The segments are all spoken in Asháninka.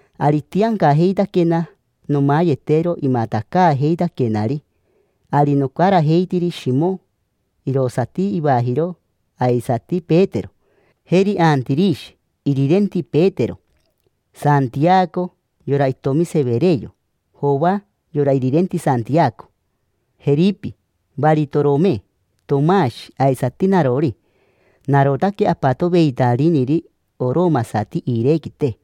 Ari itiancajeitaquena nomayetero imatacaajeitaquenari. Ari nocarajeitiri Shimo, irosati ivajiro aisati Petero; jeri Antirishi, irirenti Petero; Santiaco, yora itomi Severeo; Joa, yora irirenti Santiaco; Jeripi; Varitorome; Tomashi; aisati narori: narotaque apatoveitanariniri oromasati iirequite;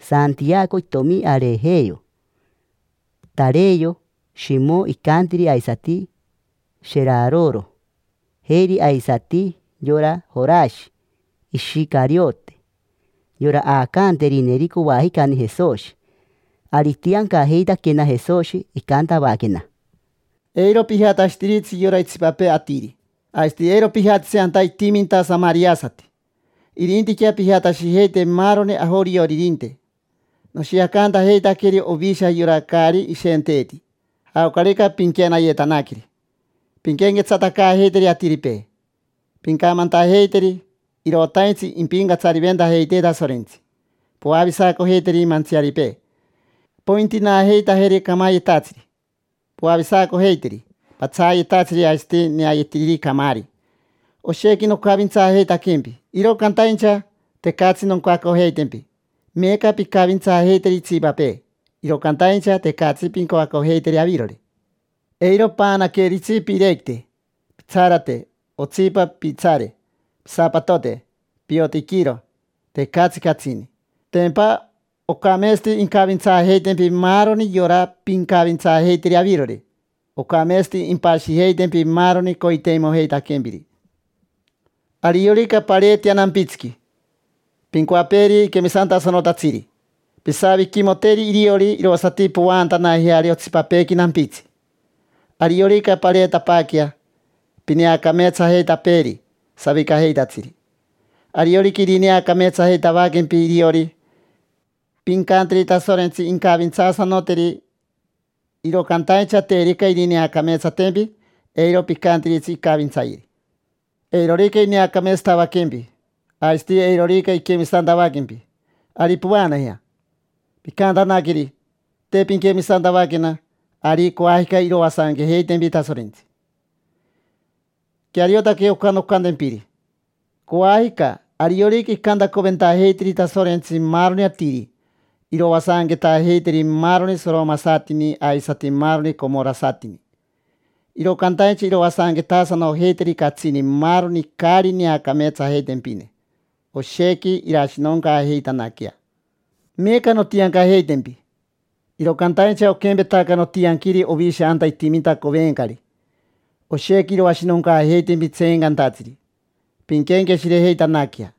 Santiaco itomi Arejeo; Tareo; Shimo, icantiri aisati Sheraroro; jeri aisati yora Jorashi Ishicariote, yora aacaanterineri coajicani Jesoshi. Ari itiancajeitaquena Jesoshi, icantavaquena: —Eiro pijatashitiritsi yora itsipapee atiri, aisati eiro pijatitsi anta itiminta samariasati. Irintiquea pijatashijeite maaroni ajorioririnte. Noshiacantajeitaqueri ovisha yora caari ishenteeti. Jaocarica pinquenayetanaqueri, pinquenquetsatacaajeiteri atiripee. Pincamantajeiteri: “Irotaintsi impincatsariventajeitee Tasorentsi”. Poavisacojeiteri mantsiaripee, pointinaajeitajeri camayetatsiri, poavisacojeiteri patsaayetatsiri aisati neayetiriri camaari. Oshequi nocavintsaajeitaquempi, iro cantaincha tecatsi noncoacojeitempi. Meeca pincavintsaajeiteri itsipapee, iro cantaincha tecatsi pincoacojeiteri avirori. Eiro paanaqueritsi piirequite, pitsarate, otsipa piitsaare, pisapatote, piotiquiro, tecatsi catsini. Tempa ocameetsati incavintsaajeitempi maaroni yora pincavintsaajeiteri avirori: ocameetsati impashijeitempi maaroni coiteimojeitaquempiri. Ariorica pareetea nampitsiqui, pincoapeeri quemisantasanotatsiri; pisaviquimoteri iriori irosati povaantanajeari otsipapeequi nampitsi. Ariorica pareetapaaquea, pineacameetsajeitapeeri savicajeitatsiri. Ariorica irineacameetsajeitavaquempi iriori, pincanteri Tasorentsi incavintsaasanoteri. Iro cantaincha terica irineacameetsatempi, eiro picantiritsi incavintsayeri. Eirorica ineacameetsatavaquempi, aisati eirorica iquemisantavaquempi, ari povaanajea. Pincantanaqueri: “Te pinquemisantavaquena, ari coajica iroasanquejeitempi Tasorentsi”. Queariotaque oca noncantempiri: coajica, ariorica incantacoventajeiteri Tasorentsi maaroni atiri, iroasanquetaajeiteri maaroni soromasatini aisati maaroni comorasatini. Iro cantaincha iroasanquetaasanojeiteri catsini maaroni caari neacameetsajeitempine, oshequi irashinoncaajeitanaquea. Meeca nontiancajeitempi, iro cantaincha oquempetaca notianquiri ovisha anta itiminta covencari: oshequi iroashinoncaajeitempi tseencantatsiri. Pinquenqueshirejeitanaquea,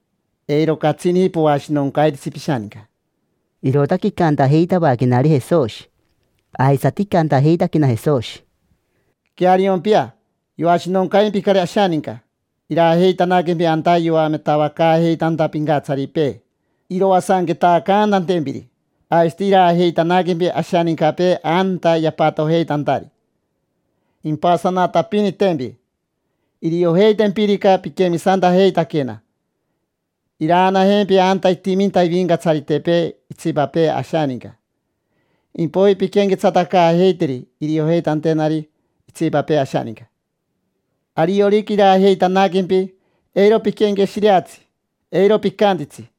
eiro catsini poashinoncairitsi pishaninca. Irootaque icantajeitavaquenari Jesoshi. Aisati icantajeitaquena Jesoshi: —Queariompia, yoashinoncaimpicari ashaninca. Iraajeitanaquempi anta yoametavacaajeitanta pincatsaripee iroasanquetaacantantempiri. Aisati iraajeitanaquempi ashanincapee anta yapatojeitantari, impasanatapinitempi. Iriojeitempirica piquemisantajeitaquena, iraanajempi anta itiminta ivincatsaritepee itsipapee ashaninca, impoiji pinquenquetsatacaajeiteri iriojeitantenari itsipapee ashaninca. Ariorica iraajeitanaquempi, eiro piquenqueshireatsi, eiro picantitsi: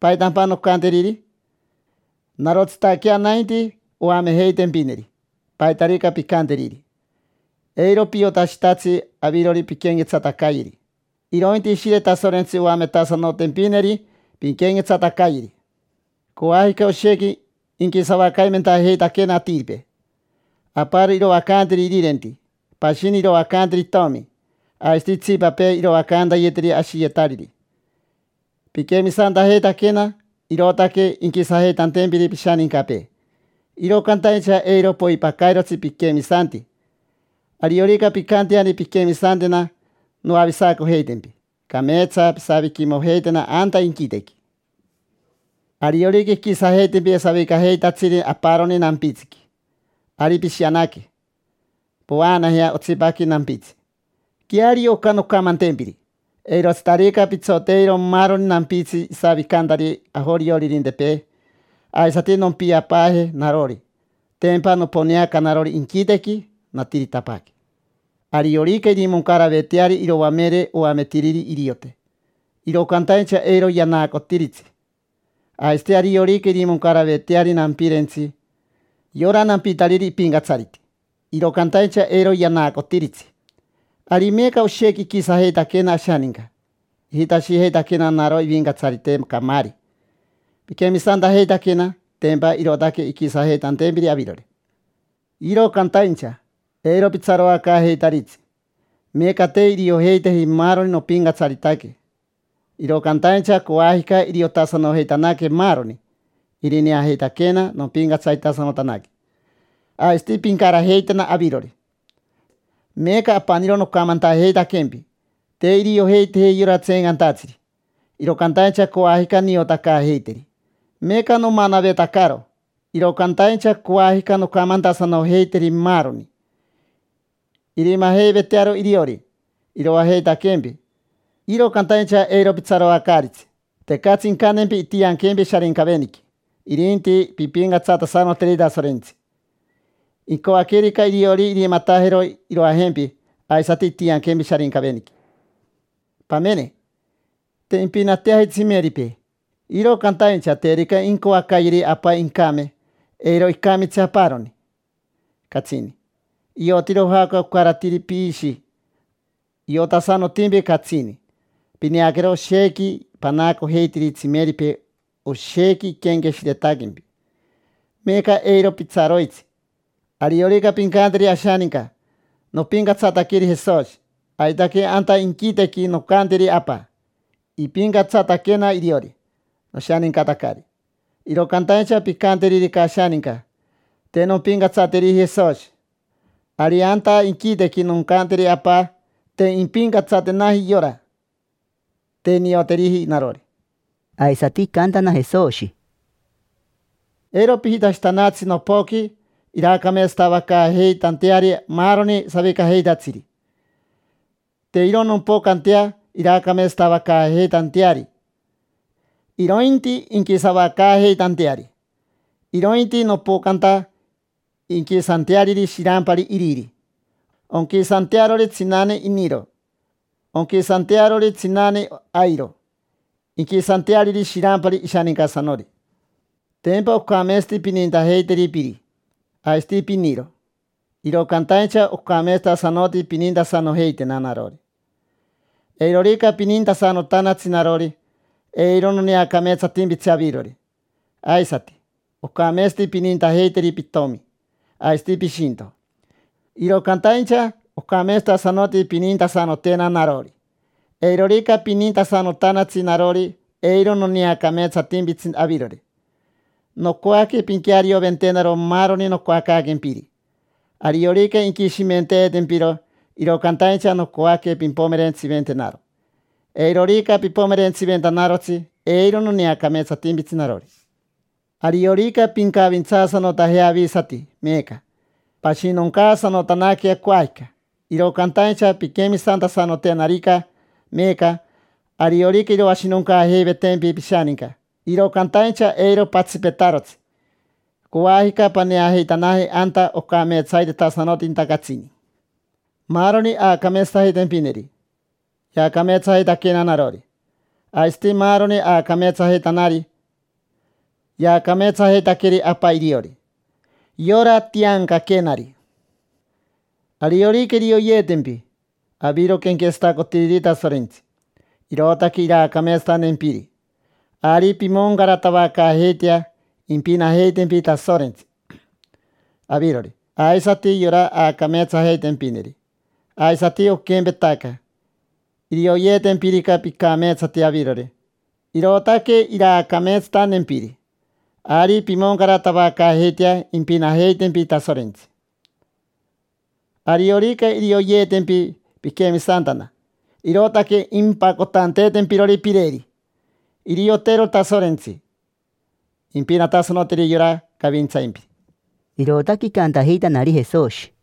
“¿Paitampa noncanteriri?” Narotsitaquea nainti oamejeitempineri paitarica pincanteriri. Eiro piotashitatsi avirori pinquenquetsatacayeri, irointi Ishire Tasorentsi oametasanotempineri pinquenquetsatacayeri. Coajica oshequi inquisavacaimentajeitaquena atiripee. Aparo iroacanteri irirenti, pashini iroacanteri itomi, aisati itsipapee iroacantayeteri ashiyetariri. Piquemisantajeitaquena, irootaque inquisajeitantempiri pishanincapee, iro cantaincha eiro poipacairotsi piquemisanti. Ariorica pincanteani pinquemisantena, noavisacojeitempi, cameetsa pisaviquimojeitena anta inquitequi. Ariorica inquisajeitempi savicajeitatsiri aparoni nampitsiqui, ari pishianaque, povaanajea otsipaqui nampitsi. Queario oca noncamantempiri: eirotsitarica pitsoteiro maaroni nampitsi isavicantari ajorioririntepee, aisati nompiapaaje narori. Tempa noponeaca narori inquitequi, natiritapaaque. Ariorica irimoncaraveteari iroamere oametiriri iriote, iro cantaincha eiro yanaacotiritsi. Aisati ariorica irimoncaraveteari nampirentsi yora nampitariri ipincatsariti, iro cantaincha eiro yanaacotiritsi. Ari meeca oshequi iquisajeitaquena ashaninca, ijitashijeitaquena naro ivincatsarite camaari. Piquemisantajeitaquena, tempa irootaque inquisajeitantempiri avirori, iro cantaincha, eiro pitsaroacaajeitaritsi. Meeca te iriojeiteji maaroni nopincatsaritaque, iro cantaincha coajica iriotasanojeitanaque maaroni; irineajeitaquena nompincatsaritasanotanaque, aisati pincarajeitena avirori. Meeca apaniro nocamantajeitaquempi, te iriojeiteji yora tseencantatsiri, iro cantaincha coajica niotacaajeiteri. Meeca nomanavetacaro, iro cantaincha coajica noncamantasanojeiteri maaroni. Irimajeivetearo iriori iroajeitaquempi, iro cantaincha eiro pitsaroacaaritsi: tecatsi incantempi intianquempi Sharincaveniqui. Irinti pimpincatsatasanoteri Tasorentsi: incoaquerica iriori irimatajero iroajempi aisati intianquempi Sharincaveniqui. Pamene, te impinateaji tsimeripee, iro cantaincha terica incoacayeri Apa incame, eiro icamitsi aparoni, catsini. Iotiro jaoca ocaratiri piishi, iotasanotimpi catsini. Pineaquero, oshequi panaacojeitiri tsimeripee, oshequi iquenqueshiretaquempi. Meeca eiro pitsaroitsi. Ariorica pincanteri ashaninca: “Nopincatsataqueri Jesoshi”, aitaque anta inquitequi noncanteri Apa: “Ipincatsataquena iriori, noshanincatacari”. Iro cantaincha pincanteririca ashaninca: “Te nompincatsateriji Jesoshi”, ari anta inquitequi noncanteri Apa: “Te impincatsatenaji yora, te nioteriji narori”. Aisati icantana Jesoshi: —Eiro pijitashitanatsi nopoqui iraacameetsatavacaajeitanteari maaroni savicajeitatsiri. Te iro nompocantea iraacameetsatavacaajeitanteari, irointi inquisavacaajeitanteari. Irointi nopocanta inquisanteariri shirampari iriri, onquisantearori tsinane iniro, onquisantearori tsinane airo, inquisanteariri shirampari ishanincasanori. Tempa ocameetsati pinintajeiteri piri aisati piniro, iro cantaincha ocameetsatasanoti pinintasanojeitena narori. Eirorica pinintasanotanatsi narori, eiro noneacameetsatimpitsi avirori. Aisati, ocameetsati pinintajeiteri pitomi aisati pishinto, iro cantaincha ocameetsatasanoti pinintasanotena narori. Eirorica pinintasanotanatsi narori, eiro noneacameetsatimpitsi avirori. Nocoaque pinquearioventenaro maaroni nocoacaaquempiri. Ariorica inquishimenteetempiro, iro cantaincha nocoaque pimpomerentsiventenaro. Eirorica pipomerentsiventanarotsi, eiro noneacameetsatimpitsi narori. Ariorica pincavintsaasanotajea avisati meeca, pashinoncaasanotanaquea coajica. Iro cantaincha pinquemisantasanotenarica meeca, ariorica iroashinoncaajeivetempi pishaninca, iro cantaincha eiro patsipetarotsi: coajica paneajeitanaje anta ocameetsaitetasanotinta catsini. Maaroni aacameetsajeitempineri, yaacameetsajeitaquena narori. Aisati maaroni aacameetsajeitanari, yaacameetsajeitaqueri Apa iriori: yora tiancaquenari. Ariorica irioyeetempi aviro quenquetsatacotiriri Tasorentsi, irootaque iraacameetsatantempiri, ari pimoncaratavacaajeitea impinajeitempi Tasorentsi: avirori, aisati yora aacameetsajeitempineri. Aisati oquempetaca, irioyeetempirica picameetsati avirori, irootaque iraacameetsatantempiri, ari pimoncaratavacaajeitea impinajeitempi Tasorentsi. Ariorica irioyeetempi piquemisantana, irootaque impacotantempirori pireri, iriotero Tasorentsi, impinatasanoteri yora cavintsaimpiri. Irootaque icantajeitanari Jesoshi.